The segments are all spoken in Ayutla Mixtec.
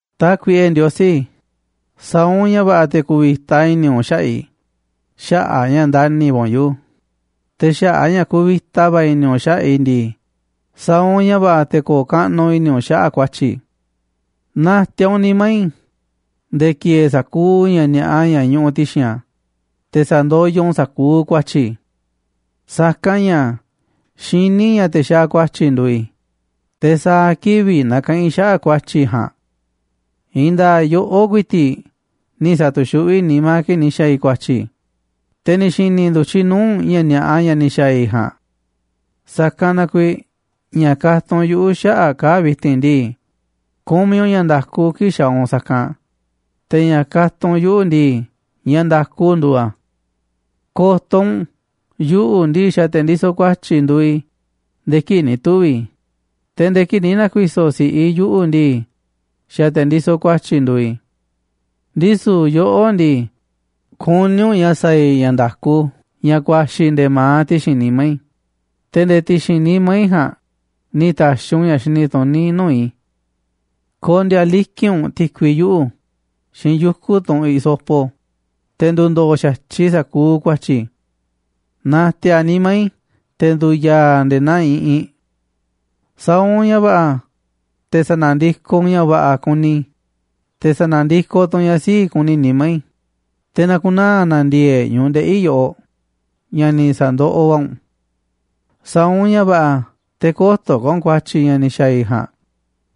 Tákuiꞌe Ndiosí, sa̱a̱ u̱nꞌ ña̱ va̱ꞌa̱ te̱ ku̱vi̱ta i̱ni̱ u̱nꞌ xaꞌa̱ꞌ i̱ xaꞌa̱ꞌ a̱ ña̱ ndani̱ va̱ u̱nꞌ yuꞌu̱, te̱ xaꞌa̱ꞌ a̱ ña̱ kuvita va̱ i̱ni̱ u̱nꞌ xaꞌa̱ꞌ i̱ ndii, sa̱a̱ u̱nꞌ ña̱ va̱ꞌa̱ te̱ ko̱o̱ kaꞌnuꞌ i̱ni̱ u̱nꞌ xaꞌa̱ꞌ ku̱a̱tyi̱ i̱. Na̱ti̱a̱ u̱nꞌ nimá i̱ nde̱e̱ ki̱e̱e̱ sa̱kuuꞌ ña̱ ni̱a̱ꞌa ña̱ ñuꞌuꞌ ti̱xi̱n a̱, te̱ sa̱ndoyoꞌ u̱nꞌ sa̱kuuꞌ ku̱a̱tyi̱ i̱. Sa̱kanꞌ ña̱ xiní i̱ ña̱ te̱ xaaꞌ ku̱a̱tyi̱ nduuꞌ i̱, te̱ sa̱a̱ kivi̱ꞌ nakaꞌanꞌ i̱ xaꞌa̱ꞌ ku̱a̱tyi̱ i̱ ja̱a̱nꞌ. I̱i̱n nda̱a̱ꞌ yoꞌó ku̱i̱ti̱ꞌ ni̱ sa̱tu̱xuꞌví nimá kii̱ꞌ ni̱ xa̱a̱ i̱ ku̱a̱tyi̱, te̱ ni̱ xi̱ni̱ ndu̱tyiꞌ nuu̱ꞌ u̱nꞌ ña̱ ni̱a̱ꞌa ña̱ ni̱ xa̱a̱ i̱ ja̱a̱nꞌ. Sa̱kanꞌ na kuiiꞌ ña̱ katunꞌ u̱nꞌ yuꞌu̱ xaꞌa̱ꞌ kaa̱ꞌ vi̱ti̱n ndii, kumiꞌ u̱nꞌ ña̱ nda̱ku kii̱ꞌ xaaꞌ u̱nꞌ sa̱kanꞌ, te̱ ña̱ katunꞌ u̱nꞌ yuꞌu̱ ndii, ña̱ nda̱ku nduuꞌ a̱. Ko̱to̱ u̱nꞌ, yuꞌu̱ ndii, xa̱ te̱ ndisoꞌ ku̱a̱tyi̱ nduuꞌ i̱ nde̱e̱ kii̱ꞌ ni̱ tuvi̱ i̱, te̱ nde̱e̱ kii̱ꞌ ni̱ na̱ku̱i̱so̱ si̱ꞌiꞌ i̱ yuꞌu̱ ndii, xa̱ te̱ ndisoꞌ ku̱a̱tyi̱ nduuꞌ i̱. Ndisu̱ yoꞌó ndii, kuní u̱nꞌ ña̱ sa̱a̱ i̱ ña̱ nda̱ku ña̱ ku̱a̱xi̱ nde̱e̱ ma̱aꞌ ti̱xi̱n nimá i̱, te̱ nde̱e̱ ti̱xi̱n nimá i̱ ja̱a̱nꞌ ni̱ ta̱xi̱ u̱nꞌ ña̱ xini tuní nuu̱ꞌ i̱. Ko̱ndi̱a̱ liki̱nꞌ u̱nꞌ ti̱kui yuꞌu̱ xiinꞌ yuku̱ tunꞌ hisopo, te̱ ndu̱ndo̱o̱ xa̱tyiꞌ sa̱kuuꞌ ku̱a̱tyi̱ i̱. Na̱ti̱a̱ nimá i̱ te̱ ndu̱ya̱a̱ a̱ nde̱e̱ naa iꞌinꞌ. Sa̱a̱ u̱nꞌ ña̱ va̱ꞌa̱ te̱ sa̱na̱ndikoꞌ u̱nꞌ ña̱ va̱ꞌa̱ kuni i̱, te̱ sa̱na̱ndikoꞌ tu̱ u̱nꞌ ña̱ sii̱ꞌ kuni nimá i̱, te̱ na̱ku̱naa̱ na ndi̱e̱e̱ꞌ ñu̱ꞌuꞌ ndeꞌi̱ i̱ yoꞌoꞌ ña̱ ni̱ sa̱ndoꞌoꞌ va̱ u̱nꞌ. Sa̱a̱ u̱nꞌ ña̱ va̱ꞌa̱ te̱ kö̱to̱ ka̱ u̱nꞌ ku̱a̱tyi̱ ña̱ ni̱ xa̱a̱ i̱ ja̱a̱nꞌ,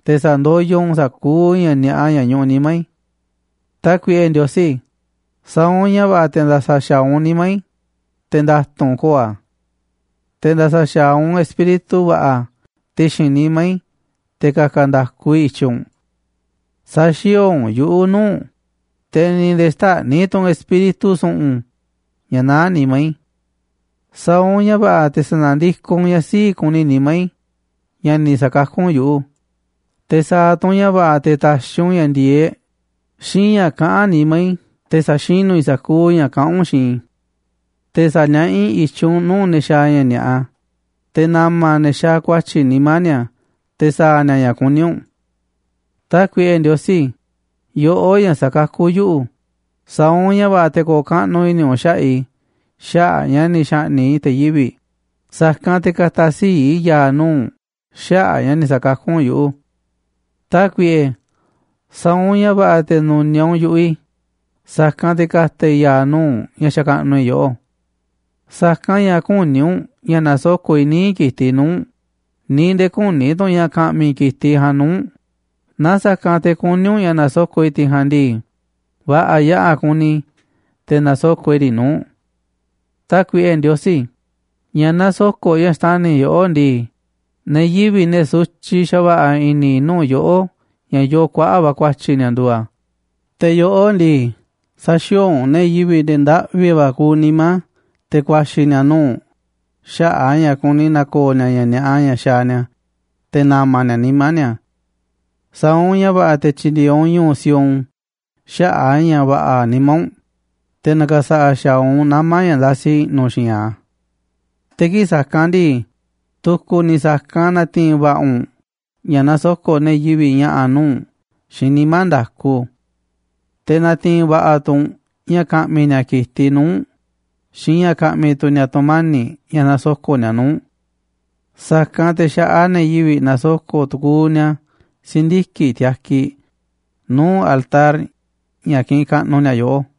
te̱ sa̱ndoyoꞌ u̱nꞌ sa̱kuuꞌ ña̱ ni̱a̱ꞌa ña̱ ñuꞌuꞌ nimá i̱. Tákuiꞌe Ndiosí, sa̱a̱ u̱nꞌ ña̱ va̱ꞌa̱ te̱ nda̱sa̱ xa̱aꞌ u̱nꞌ nimá i̱, te̱ nda̱tu̱nꞌ ko̱o̱ a̱, te̱ nda̱sa̱ xa̱aꞌ u̱nꞌ espíritu va̱ꞌa̱ ti̱xi̱n nimá i̱, te̱ ka̱ka̱ nda̱ku i̱ i̱tyiꞌ u̱nꞌ. Sä̱xi̱o̱o̱ u̱nꞌ yuꞌu̱ nuu̱ꞌ u̱nꞌ, te̱ ni̱ nde̱e̱ xtä̱ꞌniꞌ tu̱ u̱nꞌ Espíritu su̱ꞌu̱n ña̱ naá nimá i̱. Sa̱a̱ u̱nꞌ ña̱ va̱ꞌa̱ te̱ sa̱na̱ndikoꞌ u̱nꞌ ña̱ sii̱ꞌ kuni nimá i̱ ña̱ ni̱ sa̱kakú u̱nꞌ yuꞌu̱, te̱ sa̱a̱ tu̱ u̱nꞌ ña̱ va̱ꞌa̱ te̱ ta̱xi̱ u̱nꞌ ña̱ ndi̱e̱eꞌ xiinꞌ ña̱ kaꞌán nimá i̱ te̱ sa̱xinú i̱ sa̱kuuꞌ ña̱ kaꞌán u̱nꞌ xiinꞌ i̱. Te̱ sa̱niaꞌá i̱ i̱tyiꞌ u̱nꞌ nuu̱ꞌ ne̱ xaaꞌ ña̱ ni̱a̱ꞌa, te̱ na̱ma̱ ne̱ xaaꞌ ku̱a̱tyi̱ nimá ni̱a̱ te̱ sa̱a̱ ni̱a̱ ña̱ kuní u̱nꞌ. Tákuiꞌe Ndiosí, yoꞌó ña̱ sakakú yuꞌu̱, sa̱a̱ u̱nꞌ ña̱ va̱ꞌa̱ te̱ ko̱o̱ kaꞌnuꞌ i̱ni̱ u̱nꞌ xaꞌa̱ꞌ i̱ xaꞌa̱ꞌ a̱ ña̱ ni̱ xa̱ꞌni̱ꞌ i̱ te̱ yivi̱ꞌ, sa̱kanꞌ te̱ ka̱ta̱ sii̱ꞌ i̱ ya̱a̱ nuu̱ꞌ u̱nꞌ xaꞌa̱ꞌ ña̱ ni̱ sa̱kakú u̱nꞌ yuꞌu̱. Tákuiꞌe, sa̱a̱ u̱nꞌ ña̱ va̱ꞌa̱ te̱ nu̱niaꞌ u̱nꞌ yu̱ꞌuꞌ i̱, sa̱kanꞌ te̱ ka̱ta̱ i̱ ya̱a̱ nuu̱ꞌ u̱nꞌ ña̱ xakaꞌnuꞌ i̱ yoꞌó. Sa̱kanꞌ ña̱ küní u̱nꞌ ña̱ na̱soko̱ꞌ i̱ níiꞌ ki̱tiꞌ nuu̱ꞌ u̱nꞌ, ni̱ nde̱e̱ küní tu̱ u̱nꞌ ña̱ ka̱ꞌmi̱ i̱ ki̱tiꞌ ja̱a̱nꞌ nuu̱ꞌ u̱nꞌ, na sa̱kanꞌ te̱ kuní u̱nꞌ na̱soko̱ꞌ i̱ tiꞌ ja̱a̱nꞌ ndii, va̱ꞌa̱ yaꞌa̱ kuni i̱ te̱ na̱soko̱ꞌ i̱ riꞌ nuu̱ꞌ u̱nꞌ. Tákuiꞌe Ndiosí, ña̱ nasoko̱ꞌ ña̱ xtani̱ yoꞌó ndii, ne̱ yivi̱ꞌ, ne̱ sutyiꞌ xa̱va̱ꞌa̱ i̱ni̱ nuu̱ꞌ yoꞌó ña̱ yoo kuaꞌa̱ꞌ va̱ ku̱a̱tyi̱ ni̱a̱, nduuꞌ a̱, te̱ yoꞌó ndii, säxiooꞌ u̱nꞌ ne̱ yivi̱ꞌ, ne̱ ndaꞌvi va̱ kuuꞌ nimá te̱ ku̱a̱xi̱ ni̱a̱ nuu̱ꞌ u̱nꞌ, xaꞌa̱ꞌ a̱ ña̱ kuni na̱ko̱o̱ ni̱a̱ ña̱ ni̱a̱ꞌa ña̱ xaaꞌ ni̱a̱, te̱ na̱ma̱ ni̱a̱ nimá ni̱a̱. Sa̱a̱ u̱nꞌ ña̱ va̱ꞌa̱ te̱ tyi̱ndi̱e̱eꞌ u̱nꞌ ñu̱u̱ Sión xaꞌa̱ꞌ a̱ ña̱ va̱ꞌa̱ nimá u̱nꞌ, te̱ na̱ka̱sa̱ꞌa̱ xa̱aꞌ u̱nꞌ nama̱ ña̱ ndasiꞌ i̱ꞌnu̱ xi̱i̱nꞌ a̱. Te̱ kii̱ꞌ sa̱kanꞌ ndii, tu̱ku̱ ni̱ sa̱kanꞌ na̱ti̱i̱n va̱ꞌa̱ u̱nꞌ ña̱ na̱soko̱ꞌ ne̱ yivi̱ꞌ ña̱ꞌa̱ nuu̱ꞌ u̱nꞌ xiinꞌ nimá nda̱ku, te̱ na̱ti̱i̱n va̱ꞌa̱ tu̱ u̱nꞌ ña̱ ka̱ꞌmi̱ ni̱a̱ ki̱tiꞌ nuu̱ꞌ u̱nꞌ xiinꞌ ña̱ ka̱ꞌmi̱ tu̱ ni̱a̱ tu̱mani̱ꞌ ña̱ nasoko̱ꞌ ni̱a̱ nuu̱ꞌ u̱nꞌ. Sa̱kanꞌ te̱ xa̱ꞌaꞌ ne̱ yivi̱ꞌ na̱soko̱ꞌ tukuuꞌ ni̱a̱ si̱ndiki̱ꞌ tiakiꞌ nuu̱ꞌ altar ña̱ kiꞌinꞌ kaꞌnuꞌ ni̱a̱ yoꞌó.